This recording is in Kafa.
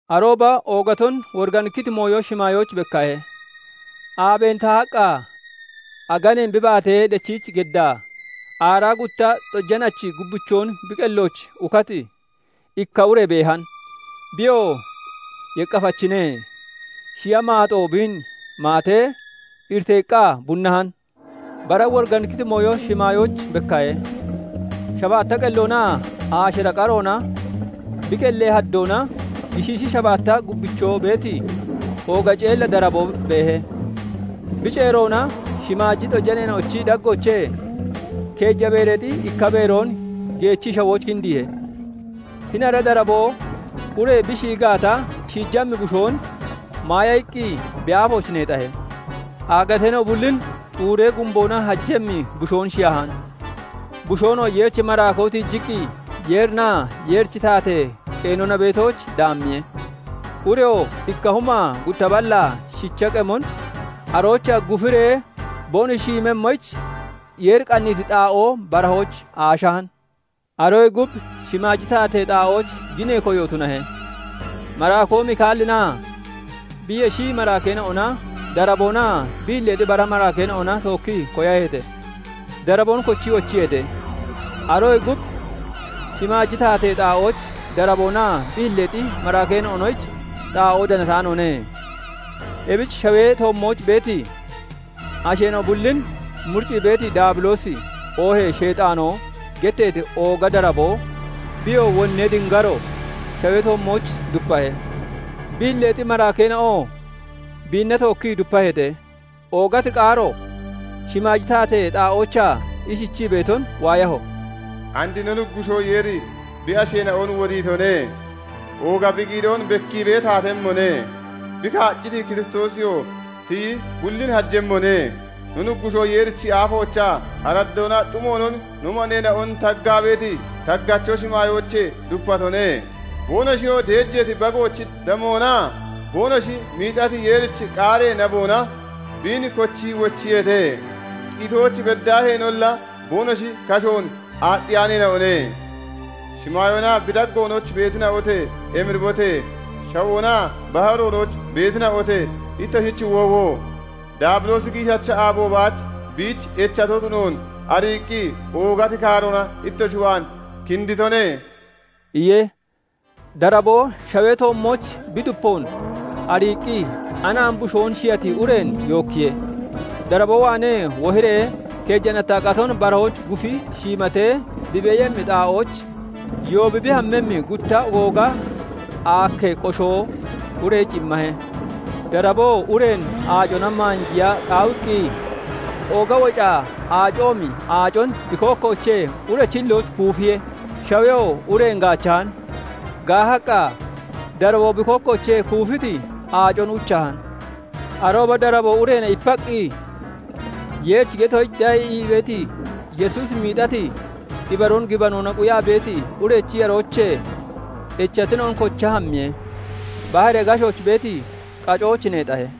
Arooba oogaton woriganikkiti mooyo shimaayooch bekkahe; aabeen tahaqqa aganeen bi baatee dechiich geddaa, aaraa gutta xojanachi gubbichoon bi qellooch ukati ikka ure beehan. Biyoo yeqqafachine; shiya maaxoo biin maatee iriteeqqa bunnahan. Bara woriganikkiti mooyo shimaayooch bekkahe; shabaatta qelloonaa aashira qaroona, bi qellee haddoona gishiishi shabaatta gubbichoo beeti ooga ceella daraboo beehe. Bi ceeroona shimaaji xojaneena'ochi daggoochee keeja beereexi ikka beeroon geechii shawooch kindiihe. Hini ara daraboo ure bi shiyi gaata shiijammi bushoon maaya iqqi bi aafooch neexahe. Aagateena'o bullin xuuree gumboona hajemmi bushoon shiyahan; bushoonoo Yeerichi maraakoo tiijiqqi Yeerinaa Yeerichi taatee qeenona beetooch daammiye. Ureyoo ikka humaa gutta ballaa shicha qemon aroochaa gufiree boonoshi shiimemmoyich, Yeeri qanniiti xaa'oo barahooch aashahan. Aroyee gub shimaaji taatee xaa'ooch ginee koyo tunahe; maraakoo Mika'eelinaa bi yeshi maraakeena'ona daraboonaa bi hilleexi bara maraakeena'ona tookkii koyaheete. Daraboon kochii wochiyeete; aroyee gub shimaaji taatee xaa'ooch daraboonaa bi hilleexi maraakeena'onoyich xaa'oo danataanoone. Ebich shawee toommooch beeti, asheena'o bullin muriccii beeti Daabiloosi oohee Sheexaanoo getteeti ooga daraboo, biyoo wonnee dingaro, shawee toommooch dupahe; bi hilleexi maraakkeena'oo biina tookkii dupaheete. Oogati qaaro shimaaji taatee xaa'oochaa ishichii beeton waayaho:- "And no Nuggushoo Yeeri bi asheena'on wodiitone; ooga bi giidoon bekkiibee taatemmone; bi kaacciti Kiristoosiyoo tiyi bullin hajemmone; no Nuggushoo Yeerichi aafoochaa araddoonaa xumoonon no maneena'on taggaa beeti taggacho shimaayoochee dupatone. Boonoshiyoo deejeeti Bagoochi damoonaa boonoshi miixati Yeerichi qaaree naboona biin kochii wochiyeete; qitooch beddaaheenolla boonoshi kashoon aaxxiyaaneena'one. Shimaayoonaa bi daggoonooch beetina'ote! Emiribote! Shawoonaa baharoonooch beetina'ote! Ittoshich woowo! Daabiloosi giishacha aabo baach biich echato tunoon ariiqqi oogati kaaroona ittoshi waan kinditone" iye. Daraboo shawee toommooch bi dupoon ariiqqi, anaami bushoon shiyati ureen yookkiye. Daraboo waanee wohiree keeja nattaa qaton barahooch gufi shiimatee bi beeyemmi xaa'ooch yoobi bi hammemmi gutta ogooga aakkee (booyee) qoshoo ureyich immahe. Daraboo ureen aacona maanjiya qaawiqqi ooga woca aacoomi aacon bi kookkoochee urechi hillooch kuufiye. Shaweyoo ureen gaachahan; gaahaqqa, daraboo bi kookkoochee kuufiti aacon uchahan. Arooba daraboo ureena ipaqqi, Yeerichi getoyich de'a ii beeti, Yesuusi miixati ibaroon gibanoona quyaa beeti urechi yaroochee echatina'on kocha hammiye; baharee gashooch beeti qacooch neexahe.